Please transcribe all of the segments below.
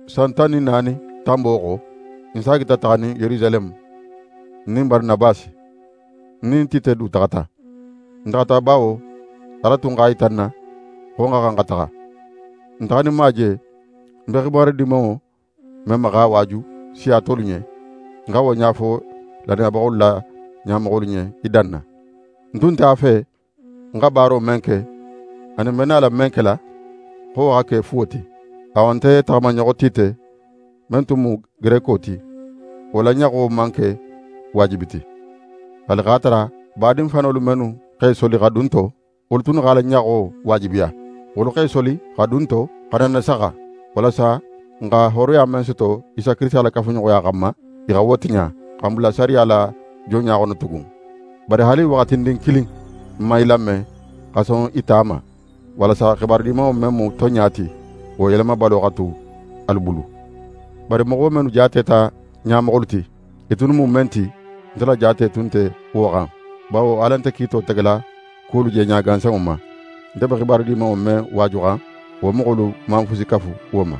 San tan nin naani tanbo xo, ń saagita taxanin Yerusaleme, ń nin Baranabasi. Ń nin Tite du taxata. Ń taxata, bawo Ala tun x'a yita ń na xo ń xa xan xa taxa. Ń taxaninma je, ń be xibaru Dimanŋo men ma x'a waaju siya tolu ɲen, ń xa wo ɲa fo lannayabaxolu la ɲamoxolu ɲen i danna. Ń tun nte a fe ń xa baaro men ke, anin ń be nala men kela, xo wo xa ke fuwo ti. Awa, nte taxamaɲoxo Tite men tun mu Gereko ti, wo la ɲaxo man ke waajibi ti; haali x'a tara badin fanolu mennu x'e soli xa dun n to, wolu tunnu x'a la ɲaxo waajibiya. Wolu x'e soli xa dun n to, xa na n nasaxa, walasa n xa hooroya men soto Isa Kirisita la kafuɲoxoya xanma, i xa wo tiɲa, xa n bula sariya la jonɲa xono tugun. Bari haali waxatindin kilin, n man i lame, xa son i ta ma; walasa Xibaru Dimanŋo men mu tonɲa ti, wo yelemabalo xa tu alu bulu. Bari moxo mennu jaateta ɲamoxolu ti, i tunnu mu men ti, nte la jaate tun nte wo xan, bawo Ala nte kiito tegela kuwolu jeɲa gansanŋo ma. Nte be Xibaru Dimanŋo men waajuxan, wo moxolu man fusi kafu wo ma.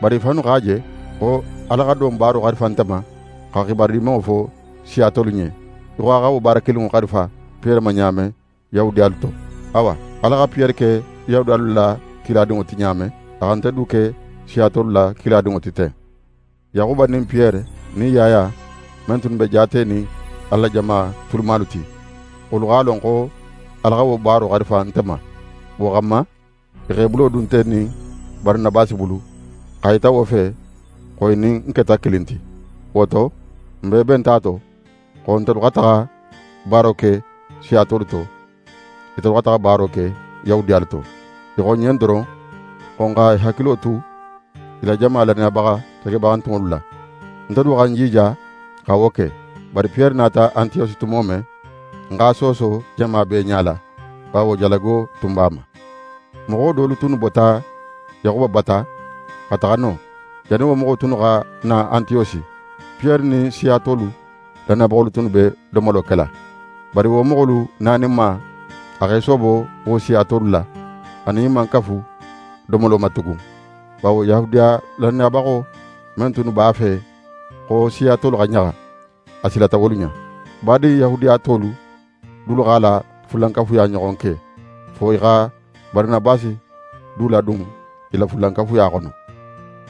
Bari i fannu x'a je xo Ala xa don baaro xarifa nte ma, xa Xibaru Dimanŋo fo siya tolu ɲen, í xo a xa wo baara kilinŋo xarifa Piyere ma ɲa men Yahudiyalu to. Awa Ala xa Piyere ke Yahudiyalu la kiladinŋo ti ɲa men, a xa nte du ke siya tolu la kiladinŋo ti ten. Yaxuba nin Piyere nin Yaya men tunnu be jaatenin Ala la jama tulumalu ti, wolu x'a lon xo Ala xa wo baaro xarifa nte ma. Wo xanma, i x'e bulo dun nte nin Baranabasi bulu, x'a yita wo fe xo i nin n keta kilin ti. Wo to, n bee benta a to xo ntelu xa taxa baaro ke siya tolu to, itelu xa taxa baaro ke Yahudiyalu to. I xo n ɲen doron xo n x'e hakilo tu i la jama lannayabaxa segebaxantunŋolu la. Nte du xa ń jija xa wo ke. Bari Piyere nata Antiyosi tumo men, ń x'a sooso jama bee ɲala, bawo jalago tun b'a ma. Moxo dolu tunnu bota Yaxuba bata xa taxa non. Jannin wo moxo tunnu xa na Antiyosi, Piyere nin siya tolu lannayabaxolu tunnu be domolo kela. Bari wo moxolu naninma, a x'é soobo wo siya tolu la, a nin i man kafu domolo ma tugun, bawo Yahudiya lannayabaxo men tunnu b'a fe xo siya tolu xa ɲaxa, a silata wolu ɲa. Badin Yahudiya tolu dulu x'a la fulankafuya ɲoxon ke, fo i xa Baranabasi du ladun i la fulankafuya xono.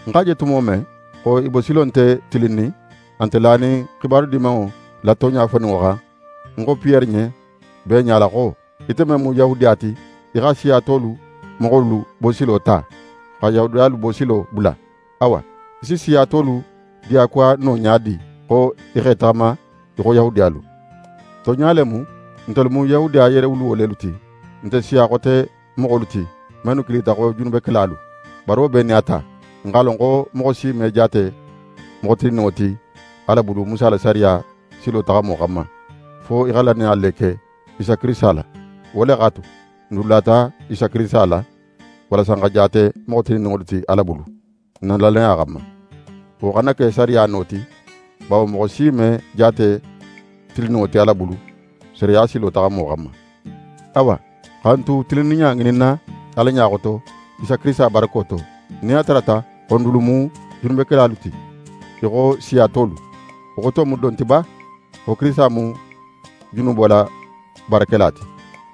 Ń x'a je tumo men xo i bosilo nte tilinnin, a nte lanin xibaru Dimanŋo la tonɲa foninŋo xan, ń xo Piyere ɲen bee ɲala xo: «Ite men mu Yahudiya ti, í xa siya tolu moxolu bosilo ta, xa Yahudiyalu bosilo bula. Awa, í si siya tolu diyakuwa no ɲa di xo i x'e taxama í xo Yahudiyalu?» Tonɲa le mu ntelu mu Yahudiya yeerewuluwo lelu ti, n nte siya xote moxolu ti, mennu kilita xo junubekelalu. Bari wo bee nin a ta, n x'a lon xo moxo si me jaate moxo tilinninŋo ti Ala bulu Musa la sariya silo taxamo xanma, fo í xa lannaya le ke Isa Kirisita la. Wo le x'a tu, n dulu lata Isa Kirisita la, walasa n xa jaate moxo tilinninŋolu ti Ala bulu, n na lannaya xanma. Wo xana ke sariya no ti, bawo moxo si me jaate tilinninŋo ti Ala bulu, sariya silo taxamo xanma. Awa, xa n tu tilinninɲa ŋininna Ala ɲa xoto, Isa Kirisita barako to, nin a tarata xo n dulu mu junubekelalu ti í xo siya tolu, wo xoto mu don ti ba xo Kirisita mu junubo la baarakela ti?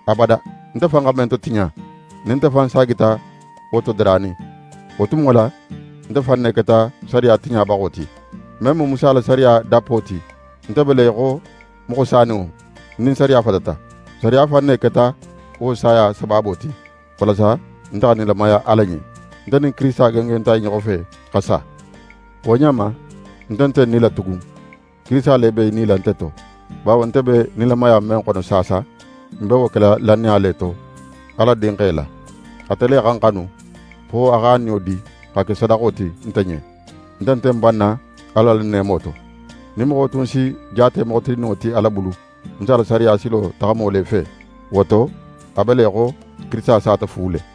Abada! Nte fan xa men totiɲa, nin nte fan saagita wo todaranin, wo tumo la, nte fan ne keta sariya tiɲabaxo ti. Men mu Musa la sariya dappo ti, nte be le í xo moxo saninŋo, ń nin sariya fatata. Sariya fan ne keta wo saya sabaabo ti, walasa nte xa nilamaya Ala ɲen. Nte nin Kirisita gengenta i ɲoxo fe, xa sa. Wo ɲa ma, nte nte ń nila tugun, Kirisita le be í nila nte to. Bawo nte be nilamaya men xono saasa, ń be wo kela lannaya le to, Ala Dinxe la. Ate le xa ń xanu, fo a x'a niyo di xa ke sadaxo ti nte ɲen. Nte nte ń banna Ala la neemo to. Nin moxo tun si jaate moxo tilinninŋo ti Ala bulu, Musa la sariya silo taxamo le fe, wo to a be í xo Kirisita sata fu le.